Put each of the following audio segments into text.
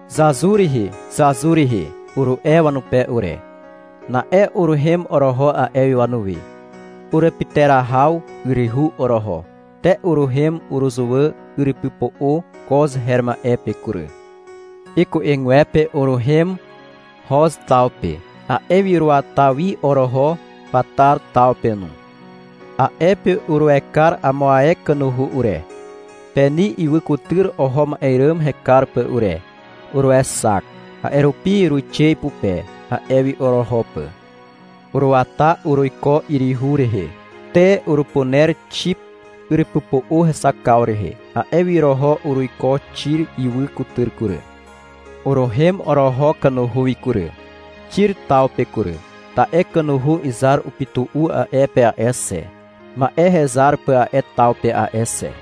— Zazur rihi zazur rihi, uru'e wanupe ure. Na'e uruhem oroho a'e wi wanuwi. Urupyterahaw yryhu oroho. Te uruhem uruzuwà yrypypo'o Koz her ma'e pe kury. Iku'egwepe uruhem Hoz taw pe. A'e wi uruata wi oroho Patar taw pe no. A'e pe uruekar amo ae kanuhu ure, Peni ywy kutyr oho ma'e ràm hekar pà ure. Uruexak. A'e rupi uruixe ipupe, a'e wi oroho pà. Uruata uruiko yryhu rehe. Te, urupuner Xip yrypypo'o hexakaw rehe. A'e wi oroho uruiko Xir ywy kutyr kury. Uruhem oroho kanuhu wi kury, Xir taw pe kury. Ta'e kanuhu izar upytu'u a'e pe a'e xe, ma'e hezar pà a'e taw pe a'e xe.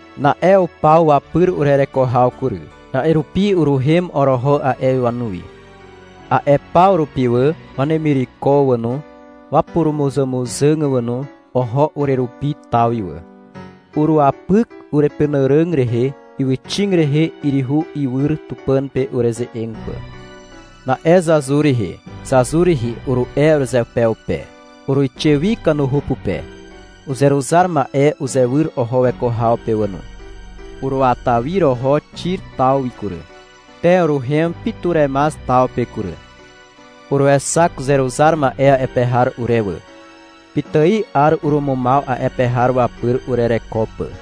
Na'e upaw wapyr urereko haw kury. A'e rupi uruhem oroho a'e wi wanuwi. A'e paw rupi wà, wanemireko wà no, wapurumuzàmuzàg wà no, oho urerupi taw wi wà. Uruwapyk urepenàràg rehe ywyxig rehe yryhu iwyr Tupàn pe ureze'eg pà. Na'e — Zazur rihi zazur rihi, uru'e urezeupeupe. Uruixe wi kanuhu pupe. Uzeruzar ma'e uzewyr oho weko haw pe wà no. Uruata wi oroho Xir taw wi kury. Te uruhem Pituremaz taw pe kury. Uruexak uzeruzar ma'e a'e pe har ure wà. Pitài 'ar urumumaw a'e pe har wapyr urereko pà.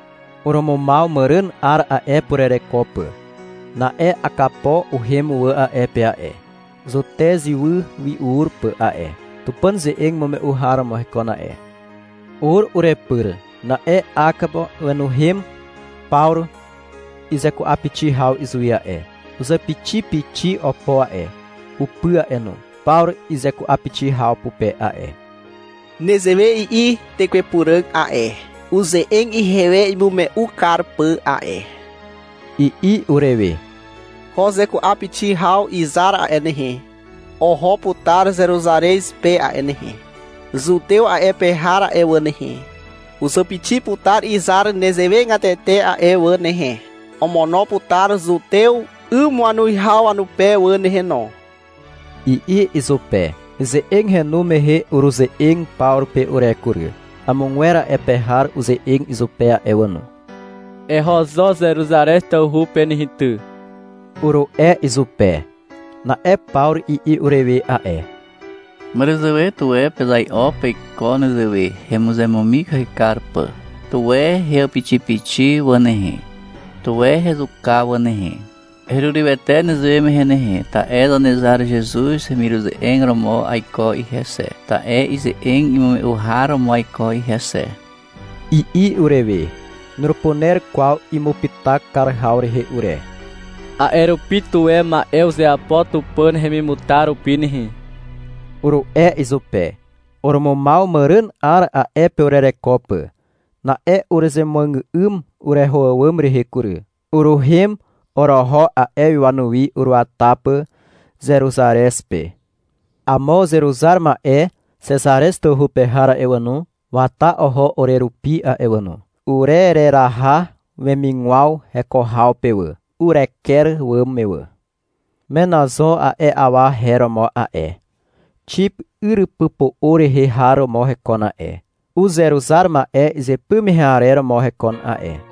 Urumumaw màràn 'ar a'e pe urereko pà. Na'e Akapo uhem wà a'e pe a'e, Zutez ywy wi ur pà a'e. Tupàn ze'eg imume'u har romo hekon a'e. Ur urepyr. Na'e Akapo wenuhem Pawru izeku'apixi haw izuwi a'e. Uzàpixipixi opo a'e, upy a'e no, Pawru izeku'apixi haw pupe a'e. — Nezewe i'i Tekwe Puràg a'e, uze'eg ihewe imume'u kar pà a'e, i'i urewe. — Ko zeku'apixi haw izar a'e nehe, oho putar Zeruzarez pe a'e nehe. Zutew a'e pe har a'e wà nehe, uzàpixi putar izar nezewegatete a'e wà nehe. Omono putar zutew 'ym wanuwihaw wanupe wà nehe no, i'i izupe. Ize'eg henu mehe uruze'eg Pawru pe ure kury. Amogwer a'e pe har uze'eg izupe a'e wà no. — Eho zo Zeruzarez tawhu pe nehe ty, uru'e izupe. Na'e Pawru i'i urewe a'e. — Màràzàwe tuwe pezai'o peiko nezewe, hemuzemumikahy kar pà. Tuwe heàpixipixi wà nehe. Tuwe hezuka wà nehe. Herurywete nezewe mehe nehe, ta'e Zanezar Zezuz hemiruze'eg romo aiko ihe xe, ta'e ize'eg imume'u har romo aiko ihe xe, i'i urewe. Nurupuner kwaw imupyta kar haw rehe ure. A'e rupi — Tuwe ma'e uzeapo Tupàn hemimutar rupi nehe, uru'e izupe. Urumumaw màràn 'ar a'e pe urereko pà. Na'e uruzemuàgà'ym ureho àwàm rehe kury. Uruhem oroho a'e wi wanuwi, uruata pà Zeruzarez pe. Amo uzeruzar ma'e Xezarez tawhu pe har a'e wà no, wata oho urerupi a'e wà no. Urereraha wemigwaw heko haw pe wà, ureker àwàm me wà. Menazo a'e awa her romo a'e, Xip yrypypo'o rehe har romo hekon a'e. Uzeruzar ma'e izypy mehe arer romo hekon a'e.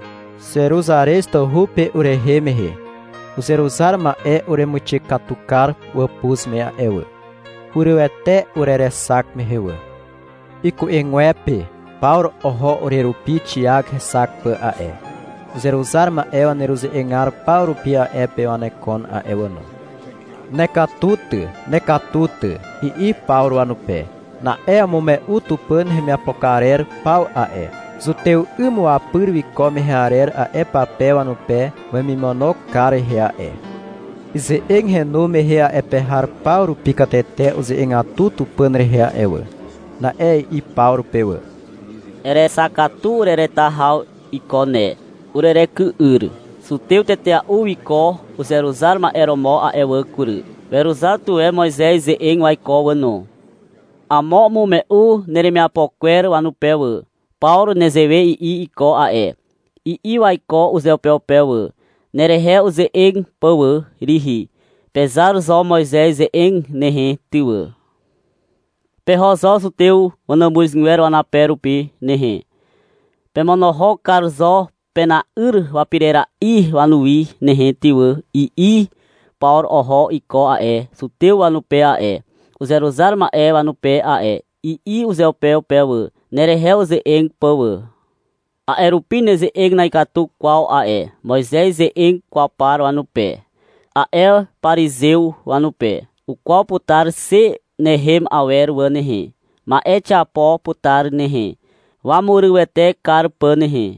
Zeruzarez tawhu pe urehem mehe uzeruzar ma'e uremuixe katu kar wàpuz me a'e wà. Hurywete urerexak mehe wà. Iku'egwepe Pawru oho urerupi Xiak hexak pà a'e. Uzeruzar ma'e waneruze'egar paw rupi a'e pe wanekon a'e wà no. — Nekatu ty nekatu ty, i'i Pawru wanupe. Na'e umume'u Tupàn hemiapo karer paw a'e, zutew 'ym wapyr wiko mehe arer a'e pape wanupe wemimono kar rehe a'e. Ize'eg henu mehe a'e pe har paw rupi katete uze'egatu Tupàn rehe a'e wà. Na'e i'i Pawru pe wà. — Erexak katu urereta haw iko ne, ureryky'yr. Zutew tetea'u wiko uzeruzar ma'e romo a'e wà kury. Weruzar tuwe Moizez ze'eg waiko wà no. Amo umume'u neremiapo kwer wanupe wà. — Pawru nezewe i'i iko a'e, i'i waiko uzeupeupe wà, nerehe uze'eg pà wà rihi. — Pezar zo Moizez ze'eg nehe ty wà. Peho zo zutew wanàmuzgwer wanape rupi nehe. Pemonohok kar zo pena'yr wapirera'i wanuwi nehe ty wà, i'i Pawru oho iko a'e, zutew wanupe a'e, uzeruzar ma'e wanupe a'e, i'i uzeupeupe wà, nerehe uze'eg pà wà. — A'e rupi neze'eg na'ikatu kwaw a'e Moizez ze'eg kwaw par wanupe, a'e parizew wanupe. Ukwaw putar xe nehem awer wà nehe. Ma'e xiapo putar nehe, wamurywete kar pà nehe.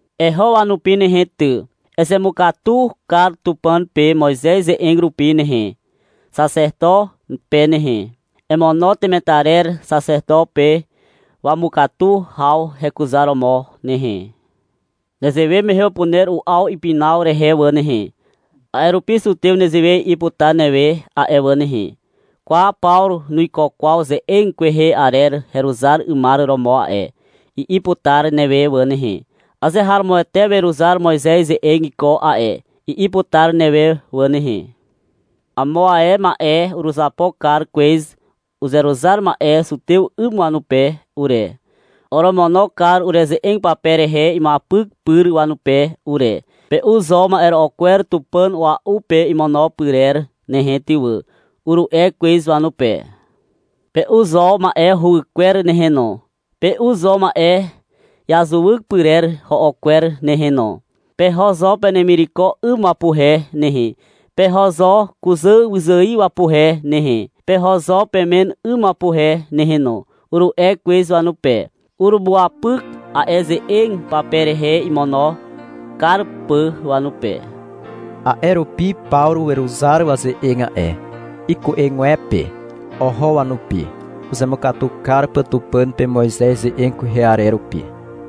Eho wanupi nehe ty. Ezemukatu kar Tupàn pe Moizez ze'eg rupi nehe, xaxeto pe nehe. Emono temetarer xaxeto pe wamukatu haw hekuzaromo nehe. Nezewe mehe upuner u'aw ipinaw rehe wà nehe. A'e rupi zutew nezewe i'i putar newe a'e wà nehe. — Kwa Pawru nuiko kwaw ze'eg kwehe arer heruzar 'ymar romo a'e, i'i putar newe wà nehe. — Azeharomoete weruzar Moizez ze'eg iko a'e, i'i putar newe wà nehe. Amo ae ma'e uruzapo kar kwez uzeruzar ma'e zutew 'ym wanupe ure. Oromono kar ureze'eg pape rehe imuapyk pyr wanupe ure. — Pe'u zo ma'ero'o kwer tupàn a'ua'u pe imono pyrer nehe ty wà, uru'e kwez wanupe. — Pe'u zo ma'e huwykwer nehe no. Pe'u zo ma'e i'azuwyk pyrer ho'o kwer nehe no. Peho zo penemireko 'ym wapuhe nehe, peho zo kuzà wyzài wapuhe nehe, peho zo pemen 'ym wapuhe nehe no, uru'e kwez wanupe. Urumuapyk a'e ze'eg pape rehe, imono kar pà wanupe. A'e rupi Pawru weruzar waze'eg a'e. Iku'egwepe oho wanupi, uzemukatu kar pà Tupàn pe Moizez ze'eg kwehe arer rupi.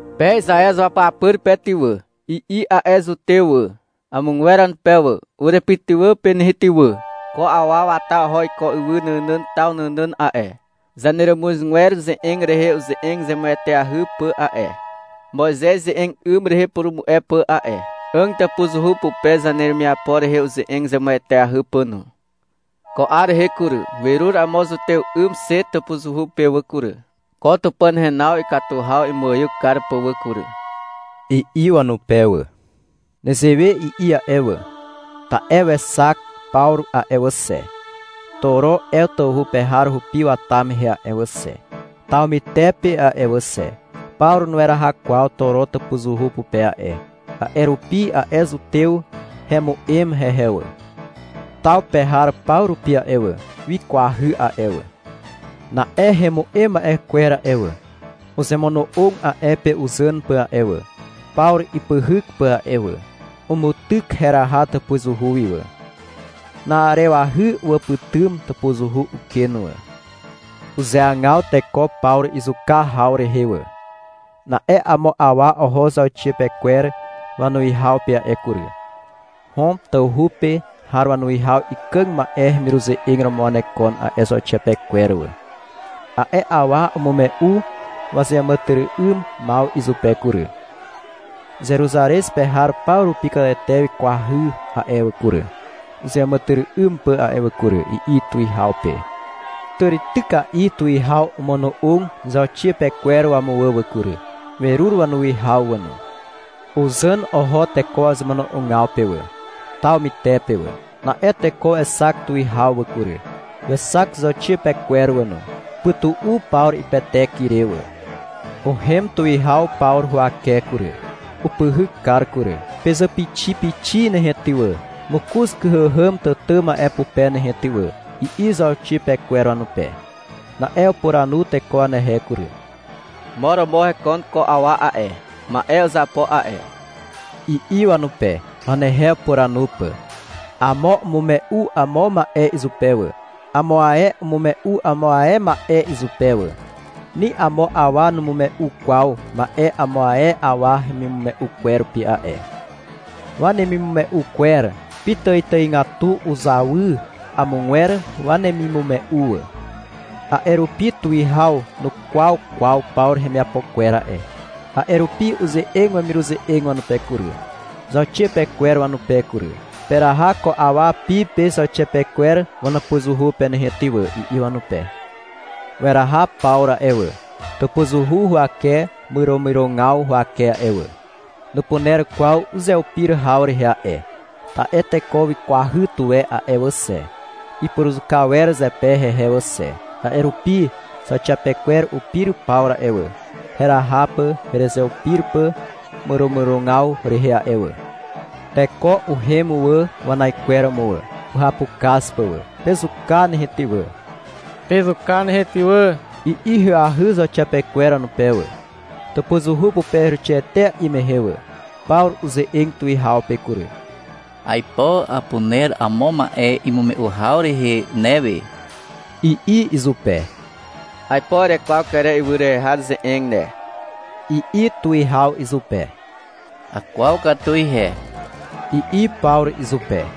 — Pe Izaew izuapyapyr pe ty wà, i'i a'e zutew wà, amogwer wanupe wà. — Urepytywà pe nehe ty wà. Ko awa wata oho iko ywy nànàn taw nànàn a'e, zaneràmuzgwer ze'eg rehe uze'eg zemueteahy pà a'e, Moizez ze'eg 'ym rehe upurumu'e pà a'e, 'àg tàpuzuhu pupe zaneremiapo rehe uze'eg zemueteahy pà no. Ko 'ar rehe kury, werur amo zutew 'ym xe tàpuzuhu pe wà kury, ko Tupàn henaw ikatu haw imuaiw kar pà wà kury, i'i wanupe wà. Nezewe i'i a'e wà, ta'e wexak Pawru a'e wà xe, Toro Ew tawhu pe har hupi wata mehe a'e wà xe, taw mytepe a'e wà xe. Pawru nueraha kwaw Toro tàpuzuhu pupe a'e. A'e rupi a'e zutew hemu'em hehe wà. Taw pe har paw rupi a'e wà, wikwahy a'e wà. Na'e hemu'em ma'e kwer a'e wà, uzemono'og a'e pe uzàn pà a'e wà, Pawru ipyhyk pà a'e wà. Umutyk heraha tàpuzuhu wi wà. Na'arewahy uwàpytym tàpuzuhu uken wà. Uzeagaw teko Pawru izuka haw rehe wà. Na'e amo awa oho zauxiapekwer wanuwihaw pe a'e kury. Hom tawhu pe har wanuwihaw ikàg ma'e hemiruze'eg romo wanekon a'e zauxiapekwer wà. A'e awa umume'u wazeàmàtyry'ymaw izupe kury. — Zeruzarez pe har paw rupi katete wikwahy a'e wà kury, uzeàmàtyry'ym pà a'e wà kury, i'i tuwihaw pe. Tàrityka'i tuwihaw omono'og zauxiapekwer wamuwà wà kury, werur wanuwihaw wà no. Uzàn oho teko wazemono'ogaw pe wà, taw mytepe wà. Na'e teko wexak tuwihaw wà kury, wexak zauxiapekwer wà no. Upytu'u Pawru ipetek ire wà. Uhem tuwihaw Pawru huwake kury. Upyhyk kar kury. — Pezàpixipixi nehe ty wà, mokoz kyhàhàm tàtà ma'e pupe nehe ty wà, i'i zauxiapekwer wanupe. Na'e upuranu teko wanehe kury. — Mo romo hekon ko awa a'e, ma'e uzapo a'e, i'i wanupe, wanehe upuranu pà. Amo umume'u amo ma'e izupe wà. Amo ae umume'u amo ae ma'e izupe wà. Ni amo awa numume'u kwaw ma'e amo ae awa hemimume'u kwer rupi a'e. Wanemimume'u kwer pitàitàigatu uzawy amogwer wanemimume'u wà. A'e rupi tuwihaw nukwaw kwaw Pawru hemiapo kwer a'e. A'e rupi uze'eg wemiruze'eg wanupe kury, zauxiapekwer wanupe kury. — Peraha ko awa pi pe zauxiapekwer wanàpuzuhu pe nehe ty wà, i'i wanupe. Weraha Pawru a'e wà, tàpuzuhu huwake myromyrogaw huwake a'e wà. Nupuner kwaw uzeupir haw rehe a'e, ta'e teko wikwahy tuwe a'e wà xe. Ipuruzuka wer zepe hehe wà xe. A'e rupi zauxiapekwer upir Pawru a'e wà, heraha pà heruzeupir pà myromyrogaw rehe a'e wà. Teko uhem wà wanaikweromo wà, uhapukaz pà wà. — Pezuka nehe ty wà, pezuka nehe ty wà, i'i ahyahy zauxiapekwer wanupe wà. Tàpuzuhu pupe heruixe etea'i mehe wà, Pawru uze'eg tuwihaw pe kury. — Aipo apuner amo ma'e imume'u haw rehe newe, i'i izupe. — Aipo erekwaw Kere ywy rehe har ze'eg ne, i'i tuwihaw izupe. — Akwaw katu ihe, i'i Pawru izupe.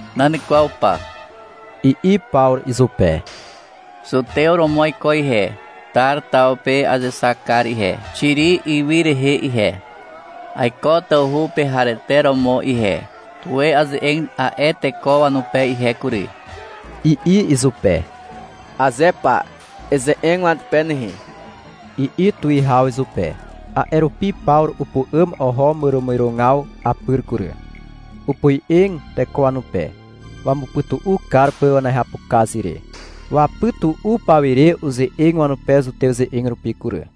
— Nan kwaw pa, i'i Pawru izupe. — Zutew romo aiko ihe. Tar taw pe azexak kar ihe, Xiri ywy rehe ihe. Aiko tawhu pe harete romo ihe. Tuwe aze'eg a'e teko wanupe ihe kury, i'i izupe. — Aze pa, eze'eg wanupe nehe, i'i tuwihaw izupe. A'e rupi Pawru upu'àm oho myromyrogaw apyr kury. Opoe'eg teko wanupe, wamupytu'u kar pà wanehapukaz re. Wapytu'u pawire uze'eg wanupe zutew ze'eg rupi kury.